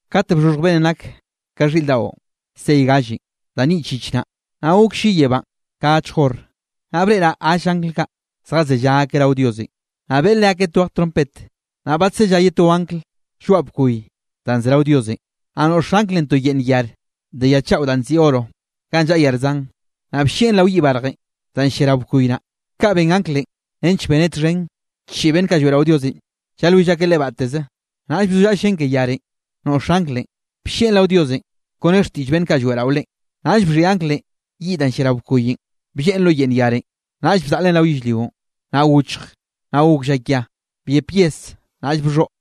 Kate bxhoxhj beꞌnnenꞌ nak ka xhiꞌr daꞌon sey gallenꞌ da nyiꞌch yich naꞌ, naꞌ gok lli yebánꞌ ka achj hor. Naꞌ breꞌraꞌ gall angl kaꞌ, zjazellá akeꞌ rao Diosenꞌ, naꞌ beꞌe leakeꞌ twej trompet. Naꞌll badsellá ye to angl lloaꞌ bkoy danꞌ ze rao Diosenꞌ. Naꞌ noꞌx anglenꞌ to yeꞌnn yare de ya chaꞌo danꞌ nziꞌi oro ganꞌ llaꞌa yar zan, naꞌ bllieꞌn rao yiꞌ barjenꞌ danꞌ llia rao bkoy naꞌ. Kaꞌn ben anglenꞌ nench beneꞌ txhen chiꞌi beꞌnn kaꞌ lloeꞌrao Diosenꞌ llalwill akeꞌ Leꞌe batteze. Naꞌll bzollaꞌa llen ke yarenꞌ noꞌx anglenꞌ, bllieꞌn rao Diosenꞌ kone xtiꞌll beꞌnn kaꞌ lloeꞌrao Leꞌen. Naꞌll bxhiꞌi anglenꞌ yiꞌ danꞌ llia rao bkoyenꞌ blleꞌen lo yeꞌnn yare, naꞌll bzaꞌlen rao yellrionꞌ, naꞌ gochj, naꞌ gok llakia, byep yes naꞌll bxhoꞌ.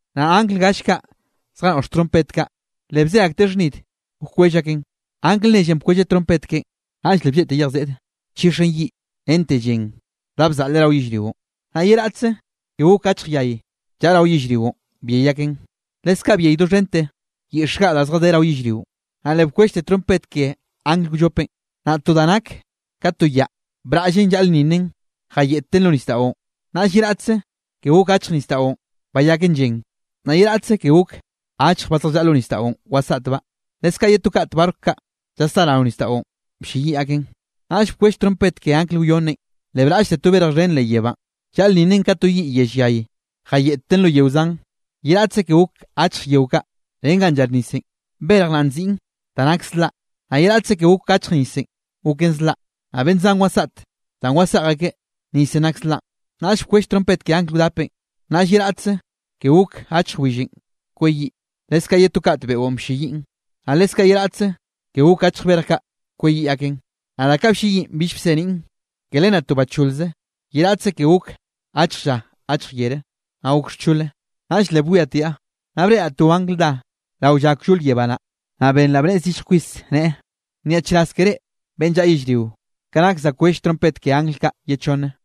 Naꞌ angl gall kaꞌ zjanoꞌx trompet kaꞌ, le bze akteꞌ xhnid wkwell akeꞌn. Angl nellenꞌ bkwelleꞌ trompet keꞌen, naꞌll le blleꞌte yej seꞌde nchixen yiꞌ rente llen da bzaleꞌ rao yellrionꞌ. Naꞌ ye raꞌtze ke gok achj yay llaꞌa rao yellrionꞌ byey aken, leskaꞌ byey doxhente yiꞌx gaꞌ da zjadé rao yellrionꞌ. Naꞌ le bkwellte trompet ke angl wllopenꞌ, naꞌ to da nak ka to yaꞌ, braꞌllen llaꞌlnninnen jayeꞌtten lo nisdaꞌon. Naꞌll ye raꞌtze ke gok achj nisdaꞌon bayaken llen. Naꞌ ye raꞌtze ke gok achje ba, zjallaꞌa lo nisdaꞌon wasaꞌtbaꞌ, leskaꞌ ye to kat barco kaꞌ llasdá rao nisdaꞌon blleyiꞌ aken. Naꞌll bkwell trompet ke angl wyonnenꞌ, le braꞌllte to berj xhen leꞌ yebánꞌ, llaꞌlnninnen ka to yiꞌ yell yay. Jayeꞌten lo yeo zan, ye raꞌtze ke gok achje yeo kaꞌ ren ganꞌ llar nisenꞌ. Berj naꞌ nziꞌn Da Nak Zlaꞌ. Naꞌ ye raꞌtze ke gok achj nisenꞌ goken zlaꞌ, naꞌ beꞌnn zan wasaꞌt danꞌ waseꞌj akeꞌ nisenꞌ nak zlaꞌn. Naꞌll bkwell trompet ke angl wdapenꞌ, naꞌll ye raꞌtze ke gok achj willenꞌ kweyiꞌ, leskaꞌ ye to kat beꞌon blleyiꞌn, naꞌ leskaꞌ ye raꞌtze ke gok achj berj kaꞌ kweyiꞌ aken. Naꞌ da kaꞌ blleyiꞌn bill bseniꞌn. Ke len naꞌ to bacholze ye raꞌtze ke gok achj lla achj yere, naꞌ gok xchole. Naꞌll le bwiatiaꞌ, naꞌ breꞌraꞌ to angl dá rao lla kllol yebá naꞌ, naꞌ benraꞌ bnneꞌe zillj kwis, neꞌe: —¡Nyaꞌchraz ke reꞌ beꞌnn llaꞌa yellrio, ka nak za wkwell trompet ke angl kaꞌ ye chonne!